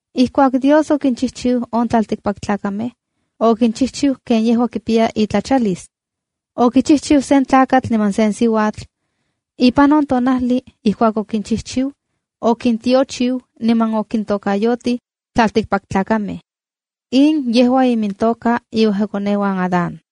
Ijkuak Dios okinchijchiu on tlaltikpaktlakamej, okinchijchiu ken yejua kipiya itlachalis. Okichijchiu sen tlakatl niman sen siuatl. Ipan on tonajli ijkuak okinchijchiu, okintiochiu niman okintokayotij “tlaltikpaktlakamej”. In yejua imintoka iuejkakoneuan Adán.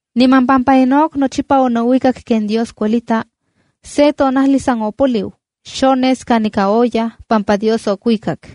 Niman pampa Enoc nochipa onouikak ken Dios kuelita, se tonajli san opoliu. Xones kanika oyaj pampa Dios okuikak.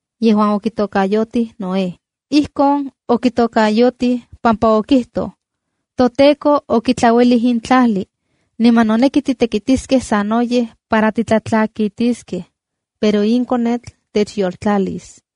yejuan okitokayotij Noé. Ijkon okitokayotij pampa okijtoj: “ToTEKO okitlauelij in tlajli, niman noneki titekitiskej sanoyej para titlatlakitiskej, pero in konetl techyoltlalis.”